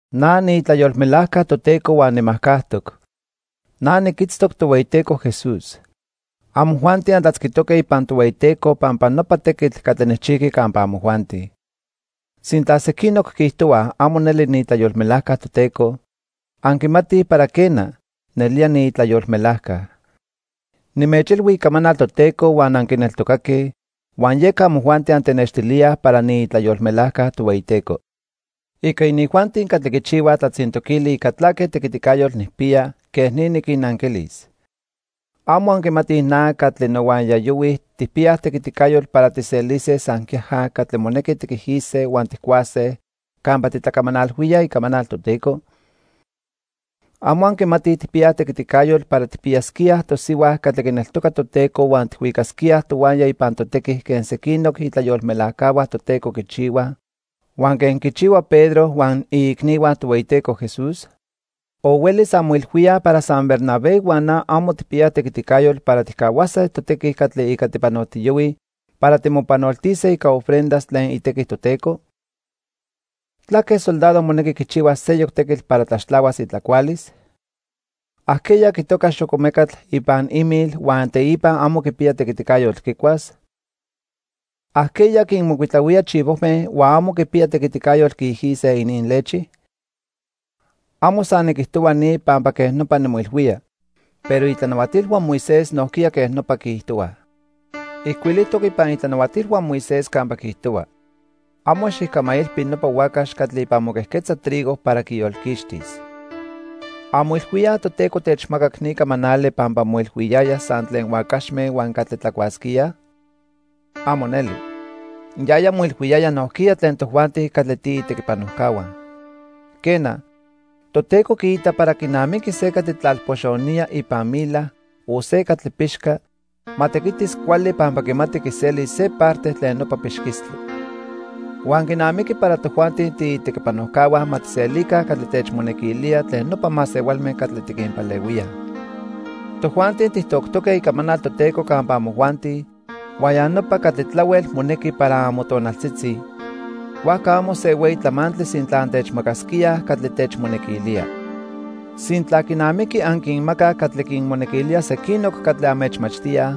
Na niitlayolmelajca Toteco huan nimajcajtoc. Na niquitztoc Tohueyiteco Jesús. Amojuanti antlatzquitoque ipan Tohueyiteco pampa nopa tequitl catli nijchijqui campa amojuanti. Sintla sequinoc quiijtohuaj amo neli niitlayolmelajca Toteco, anquimatij para quena, nelía niitlayolmelajca. Nimechilhui icamanal Toteco huan anquineltocaque, huan yeca amojuanti antenextilíaj para niitlayolmelajca Tohueyiteco. Ica inijuanti catli quichihuaj tlatzintoquili ica tlaque tequiticayotl nijpiya, quej ni niquinnanquilis. ¿Amo anquimatij na huan catli nohuaya yohuij tijpiyaj tequiticayotl para tijselise san quiaja catli monequi tiquijise huan tijcuase campa titlacamanalhuíaj icamanal Toteco? ¿Amo anquimatij tijpiyaj tequiticayotl para tijpiyasquíaj tosihua catli quineltoca Toteco huan tijhuicasquíaj tohuaya ipan totequi quen sequinoc itlayolmelajcahua Toteco quichihuaj, huan quen quichihua Pedro huan iicnihua Tohueyiteco Jesús? ¿O huelis anmoilhuíaj para san Bernabé huan na amo tijpiyaj tequiticayotl para tijcahuase totequi catli ica tipanotiyohuij para timopanoltise ica ofrendas tlen itequi Toteco? ¿Tlaque soldado monequi quichihuas seyoc tequitl para tlaxtlahuas itlacualis? ¿Ajqueya quitoca xocomecatl ipan imil huan teipa amo quipiya tequiticayotl quicuas? ¿Ajqueya quinmocuitlahuía chivojme huan amo quipiyaj tequiticayotl quiijise ininlechi? Amo san niquijtohua ni pampa quej nopa nimoilhuía, pero itlanahuatilhua Moisés nojquiya quej nopa quiijtohuaj. Ijcuilijtoc ipan itlanahuatilhua Moisés campa quiijtohua: "Amo xijcamailpi nopa huacax catli ipan moquejquetza trigo para quiyolquixtis." ¿Anmoilhuíaj Toteco techmacac ni camanali pampa moilhuiyaya san tlen huacaxme huan catli tlacuasquíaj? ¡Amo neli! Yaya moilhuiyaya nojquiya tlen tojuanti catli tiitequipanojcahua. Quena, Toteco quiita para quinamiqui se catli tlalpoxonía ipan mila o se catli pixca, ma tequitis cuali pampa quimati quiselis se parte tlen nopa pixquistli. Huan quinamiqui para tojuanti tiitequipanojcahua ma tijselica catli techmonequilía tlen nopa masehualme catli tiquinpalehuíaj. Tojuanti tijtoctoque icamanal Toteco campa amojuanti huan ya nopa catli tlahuel monequi para amotonaltzitzi, huajca amo se hueyi tlamantli sintla antechmacasquíaj catli techmonequilía. Sintla quinamiqui anquinmacaj catli quinmonequilía sequinoc catli anmechmachtíaj,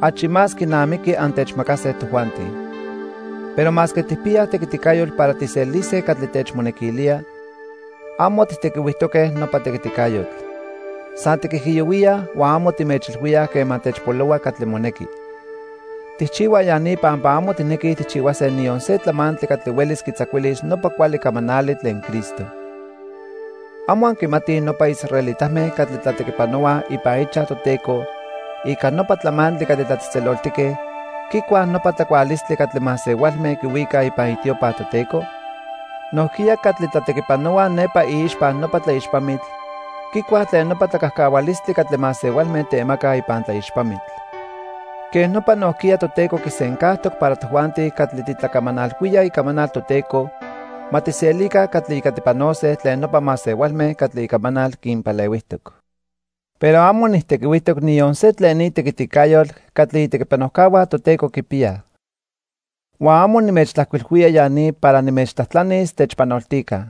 achi más quinamiqui antechmacase tojuanti. Pero masque tijpiyaj tequiticayotl para tijselise catli techmonequilía, amo tijtequihuijtoque nopa tequiticayotl. San tiquijiyohuíaj huan amo timechilhuíaj quema techpolohua catli monequi. Tijchihuaj ya ni pampa amo tijnequij tijchihuase niyon se tlamantli catli huelis quitzacuilis nopa cuali camanali tlen Cristo. ¿Amo anquimatij nopa israelitame catli tlatequipanohuaj ipan ichaj Toteco ica nopa tlamantli catli tlatzejtzeloltique, quicuaj nopa tlacualistli catli masehualme quihuicaj ipan itiopa Toteco? Nojquiya catli tlatequipanohuaj nepa iixpa nopa tlaixpamitl, quicuaj tlen nopa tlacajcahualistli catli masehualme temacaj ipan tlaixpamitl. Quej nopa nojquiya Toteco quisencajtoc para tojuanti catli titlacamanalhuíaj icamanal Toteco ma tijselica catli ica tipanose tlen nopa masehualme catli icamanal quinpalehuijtoc. Pero amo nijtequihuijtoc niyon se tlen ni tequiticayotl catli itequipanojcahua Toteco quipiyaj. Huan amo nimechtlajcuilhuía ya ni para nimechtlajtlanis techpanoltica.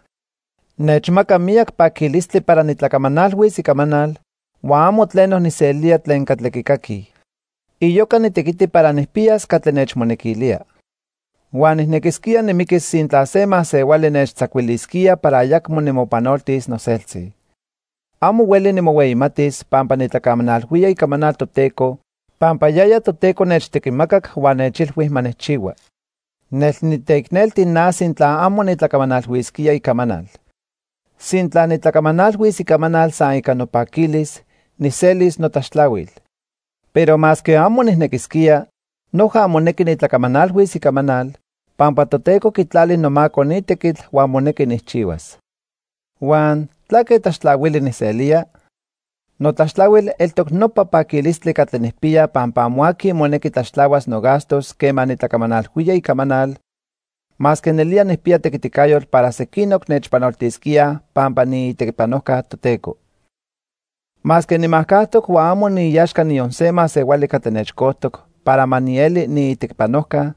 Nechmaca miyac paquilistli para nitlacamanalhuis icamanal huan amo tleno nijselía tlen catli quicaquij. Iyoca nitequiti para nijpiyas catli nechmonequilía. Huan nijnequisquía nimiquis sintla se masehuali nechtzacuilisquía para ayacmo nimopanoltis noseltzi. Amo hueli nimohueyimatis pampa nitlacamanalhuía icamanal Toteco pampa yaya Toteco nechtequimacac huan nechilhui ma nijchihua. Nel niteicnelti na sintla amo nitlacamanalhuisquía icamanal. Sintla nitlacamanalhuis icamanal san ica nopaquilis, nijselis notlaxtlahuil. Pero masque amo nijnequisquía, noja monequi nitlacamanalhuis icamanal, pampa Toteco quitlali nomaco ni tequitl huan monequi nijchihuas. Huan ¿tlaque tlaxtlahuili nijselía? Notlaxtlahuil eltoc nopa paquilistli catli nijpiya pampa amo aqui monequi tlaxtlahuas nogastos quema nitlacamanalhuía icamanal, masque nelía nijpiya tequiticayotl para sequinoc nechpanoltisquíaj pampa niitequipanojca Toteco. Masque nimajcajtoc huan amo niiaxca niyon se masehuali catli nechcojtoc para ma nieli niitequipanojca,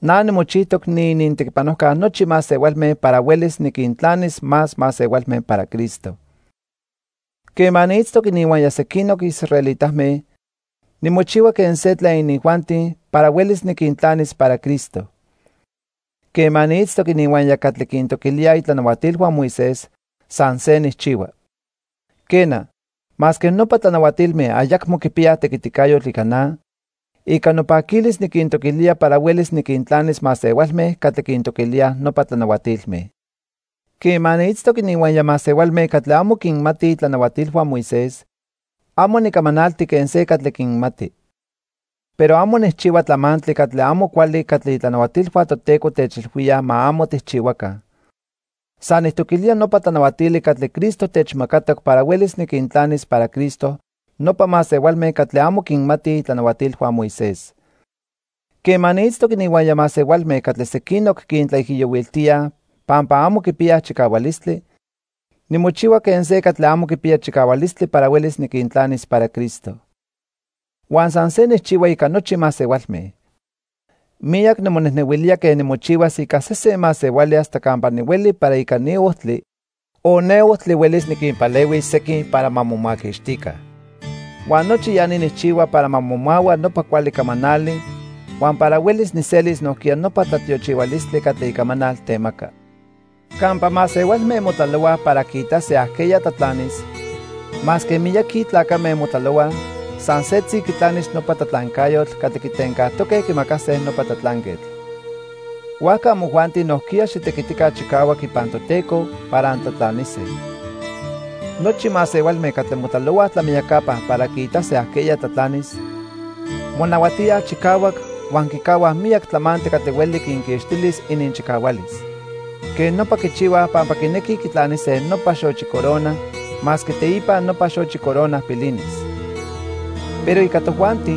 na nimochijtoc niinintequipanojca nochi masehualme para huelis niquintlanis más masehualme para Cristo. Quema niitztoc ininhuaya sequinoc israelitame, nimochihua quen se tlen inijuanti para huelis niquintlanis para Cristo. Quema niitztoc ininhuaya catli quintoquilíaj itlanahuatilhua Moisés, san se nijchihua. Quena, masque nopa tlanahuatilme ayacmo quipiyaj tequiticayotl ica na, ica nopaquilis niquintoquilía para huelis niquintlanis masehualme catli quintoquilíaj nopa tlanahuatilme. Quema niitztoc ininhuaya masehualme catli amo quinmatij itlanahuatilhua Moisés, amo nicamanalti quen se catli quinmati. Pero amo nijchihua tlamantli catli amo cuali catli itlanahuatilhua Toteco techilhuíaj ma amo tijchihuaca. San nijtoquilía nopa tlanahuatili catli Cristo techmacatoc para huelis niquintlanis para Cristo nopa masehualme catli amo quinmatij itlanahuatilhua Moisés. Quema niitztoc ininhuaya masehualme catli sequinoc quintlaijiyohuiltíaj pampa amo quipiyaj chicahualistli, nimochihua quen se catli amo quipiya chicahualistli para huelis niquintlanis para Cristo. Huan san se nijchihua ica nochi masehualme. Miyac nimonejnehuilía quen nimochihuas ica sesen masehuali hasta campa nihueli para ica ni ojtli, o ne ojtli huelis niquinpalehuis sequin para ma momaquixtica. Huan nochi ya ni nijchihua para ma momahua nopa cuali camanali huan para huelis nijselis nojquiya nopa tlatiochihualistli catli icamanal temaca. Campa masehualme motlalohuaj para quiitase ajqueya tlatlanis, masque miyaqui tlacame motlalohuaj, san setzi quitlanis nopa tlatlancayotl catli quitencajtoque quimacase nopa tlatlanquetl. Huajca amojuanti nojquiya xitequitica chicahuac ipan Toteco para antlatlanise. Nochi masehualme catli motlalohuaj tlamiyacapa para quiitase ajqueya tlatlanis, monahuatíaj chicahuac huan quicahuaj miyac tlamantli catli hueli quinquixtilis ininchicahualis. Quej nopa quichihuaj pampa quinequij quitlanise nopa xochi corona masque teipa nopa xochi corona pilinis. Pero ica tojuanti,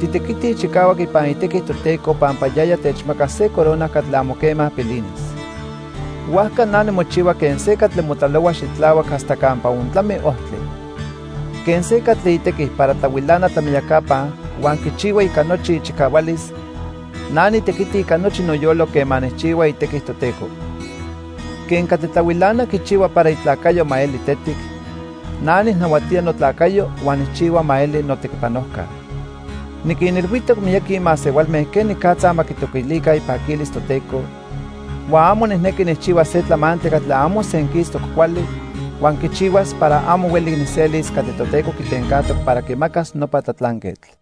titequitij chicahuac ipan itequi Toteco pampa yaya techmacas se corona catli amo quema pilinis. Huajca na nimochihua quen se catli motlalohua xitlahuac hasta campa ontlami ojtli. Quen se catli itequi para tlahuilana tlamiyacapa huan quichihua ica nochi ichicahualis, na nitequiti ica nochi noyolo quema nijchihua itequi Toteco. Quen catli tlahuilana quichihua para itlacayo ma eli tetic, na nijnahuatía notlacayo huan nijchihua ma eli notequipanojca. Niquinilhuijtoc miyaqui masehualme quenicatza ma quitoquilica ipaquilis Toteco, huan amo nijnequi nijchihuas se tlamantli catli amo senquistoc cuali huan quichihuas para amo hueli nijselis catli Toteco quitencajtoc para quimacas nopa tlatlanquetl.